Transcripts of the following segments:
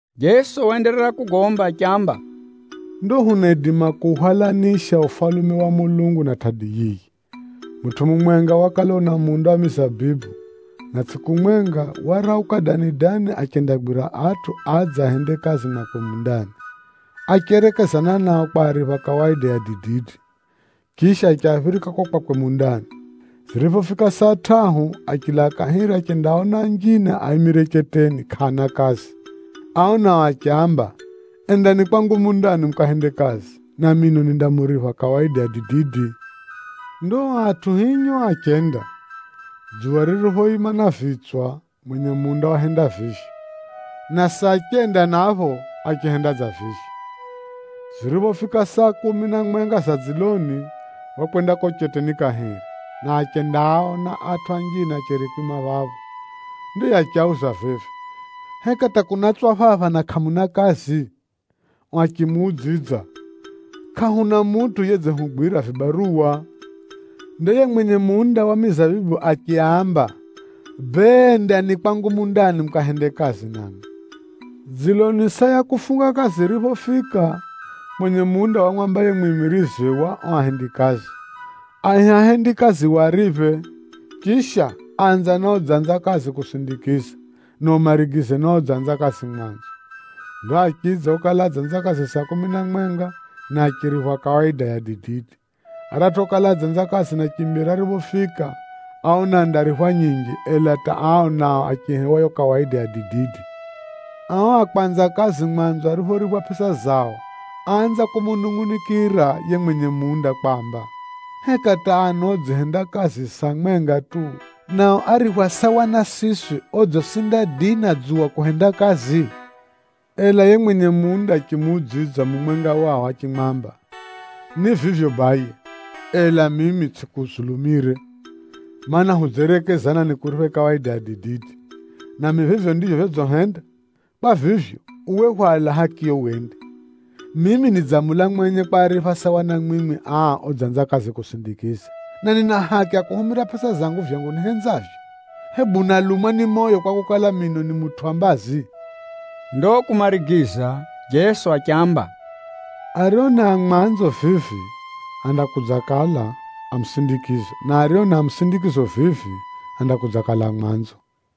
Jeso waenderera kugomba achiamba, “Ndo hunaidima kuuhwalanisha Ufalume wa Mulungu na tʼadi yiyi. Mutʼu mumwenga wakala una munda wa mizabibu, na tsʼiku mwenga, warauka dani-dani achendagwira atʼu adze ahende kazi mwakwe mundani. Acherekezana nao kwaripha kawaida ya dididi, chisha achiaphirika ko kwakwe mundani. Ziriphofika saa tʼahu, achilaa kahiri achendaaona anjine aimire cheteni kʼaana kazi. Ao nao achiaamba, ‘Endani kwangu mundani mukahende kazi, na mino nindamuripha kawaida ya dididi!’ Ndo o atʼu hinyo achenda. Dzuwa ririphoima na vitswa, mwenye munda wahenda vivyo, na saa chenda napho achihenda dza vivyo. Ziriphofika saa kumi na mwenga za dziloni, wakwenda kuko cheteni kahiri, na achendaaona atʼu anjine acheri kwima phapho. Ndo yiye achiauza vivi, ‘Heka hata kunatswa phapha na kʼamuna kazi?’ Ao achimuudzidza, ‘Kʼahuna mutʼu yedzihugwira vibaruwa.’ Ndo yiye mwenye munda wa mizabibu achiaamba, ‘Bee, endani kwangu mundani mukahende kazi namwi.’ “Dziloni saa ya kufunga kazi yiriphofika, mwenye munda wamwamba yiye mwimiriziwe wa ao ahendikazi, ‘Aihe ahendikazi wariphe. Chisha, anza na odzanza kazi kusindikiza, na umarigize na odzanza kazi mwanzo.’ Ndo achidza okala adzanza kazi saa kumi na mwenga, na achiriphwa kawaida ya dididi. Aratʼu okala adzanza kazi na chimbere ariphofika, áona andariphwa nyinji, ela hata ao nao achihewa yo kawaida ya dididi. Ao a kwanza kazi mwanzo áriphoriphwa pʼesa zao, áanza kumunungʼunikira yiye mwenye munda kwamba, ‘Heka hata ano odzihenda kazi saa mwenga tu, nao ariphwa sawa na siswi odzisinda dii na dzuwa kuhenda kazi?’ Ela yiye mwenye munda achimuudzidza mumwenga wao achimwamba, ‘Ni vivyo baye, ela mimi tsʼikuzulumire. Maana, hudzerekezana nikuriphe kawaida ya dididi, nami vivyo ndivyo vyodzihenda. Kwa vivyo, uwe hwala hakiyo wende. Mimi nidzamula mwenye kwaripha sawa na mwimwi aa odzanza kazi kusindikiza. Na nina haki ya kuhumira pʼesa zangu vyangu nihenzavyo. Hebu unalumwa ni moyo kwakukala, mino ni mutʼu wa mbazi?’” Ndo kumarigiza Jeso achiamba, “Ario ni a mwanzo vivi, andakudzakala a musindikizo na ario ni a musindikizo vivi, andakudzakala a mwanzo.”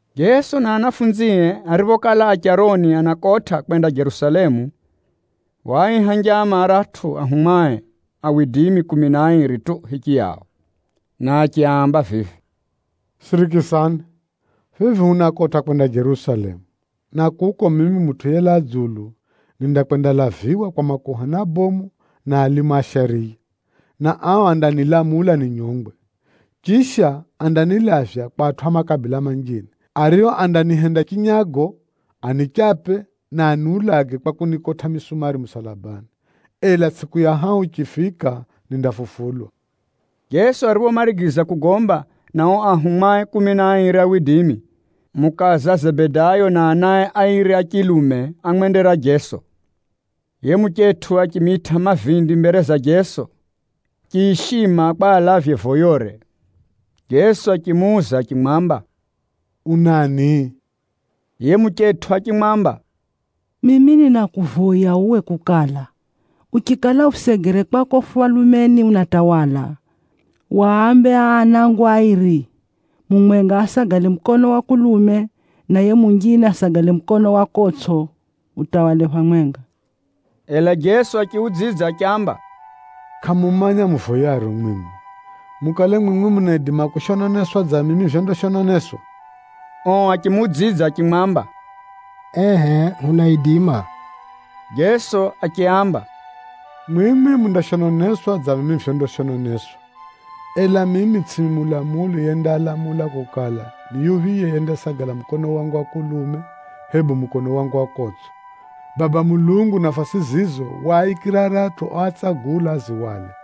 Jeso na ahumwae ariphokala a charoni anakotʼa kwenda Jerusalemu, waaiha njama aratʼu anafunzie kumi na airi tu hichiyao, na achiaamba vivi, “Sirikisani! Vivi hunakotʼa kwenda Jerusalemu, na kuko mimi Mutʼu yelaa dzulu, nindakwendalaviwa kwa makuhani abomu na alimu a shariya, na ao andanilamula ninyongwe. Chisha, andanilavya kwa atʼu a makabila manjine, ario andanihenda chinyago, anipige vibokʼo na aniulage kwa kunikotʼa misumari musalabani. Ela tsʼiku ya hahu yichifika, nindafufulwa.” Jeso ariphomarigiza kugomba na ao ahumwae kumi na airi, mukaza Zebedayo na anae airi a chilume ámwendera Jeso. Yiye muchetʼu achimitʼa mavindi mbere za Jeso chiishima kwa alavye voyore. Jeso achimuuza achimwamba, “Unani?” Yiye muchetʼu achimwamba, “Mimi ninakuvoya uwe kukala, uchikala usegere kwako Ufalumeni unatawala, wambe aa anangu airi, mumwenga asagale mukonoo wa kulume, na yiye munjine asagale mukonoo wa kotsʼo mutawale phamwenga.” Ela Jeso achiudzidza achiamba, “Kʼamumanya muvoyaro mwimwi. Mukale mwimwi munaidima kushononeswa dza mimi vyondashononeswa?” Ao achimuudzidza achimwamba, “Ehʼe hunaidima.” Jeso achiaamba, “Mwimwi mundashononeswa dza mimi vyondashononeswa, ela mimi tsʼimi mulamuli yendalamula kukala, ni yuphiye yendasagala mukono wangu wa kulume, hebu mukono wangu wa kotsʼo. Baba Mulungu nafasi zizo waaikira aratʼu oatsagula azihwale.”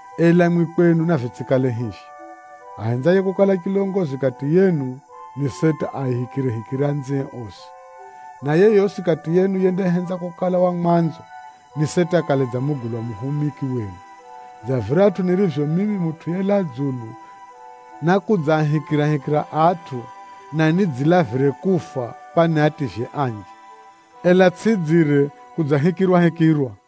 Ela mwimwi kwenu navitsʼikale hivyo. Ahenzaye kukala chilongozi kati yenu, ni seti aahikirehikire anzie osi. Na yeyosi kati yenu yendahenza kukala wa mwanzo, ni seti akale dza mugulwa muhumiki wenu, dza viratʼu nirivyo mimi Mutʼu yelaa dzulu nákudzaahikirahikira atʼu, na nidzilavire kufa kwa niativye anji. Ela tsʼidzire kudzahikirwahikirwa.”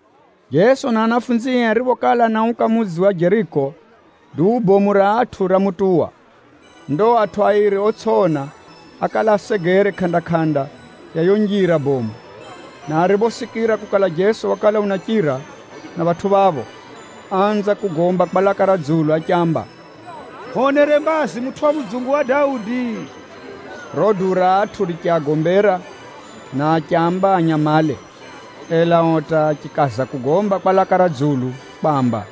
Jeso na ahumwae ariphokala anauka mudzi wa Jeriko, duu bomu ra atʼu ramutuwa. Ndo atʼu airi otsʼiona ákala asegere kʼanda-kʼanda ya yiyo njira bomu, na ariphosikira kukala Jeso wakala unachira na phatʼu phapho, áanza kugomba kwa laka ra dzulu achiamba, “Hwonere mbazi mutʼu wa mudzungu wa Daudi!” Riro duu ra atʼu richiagombera, na achiaamba anyamale. Ela ao hata achikaza kugomba kwa laka ra dzulu kwamba,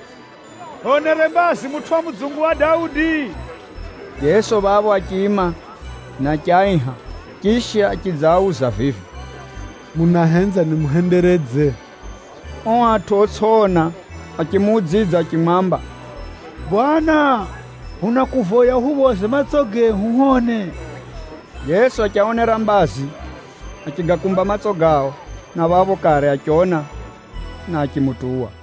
“Hwonere mbazi mutʼu wa mudzungu wa Daudi!” Jeso phapho achiima, na achiaiha. Chisha achidzaauza vivi, “Munahenza nimuhenderedze?” Ao atʼu otsʼiona achimuudzidza achimwamba, “Bwana, hunakuvoya uhuphoze matso gehu hwone.” Jeso achiaonera mbazi, achigakumba matso gao, na phapho kare achiona, na achimutuwa.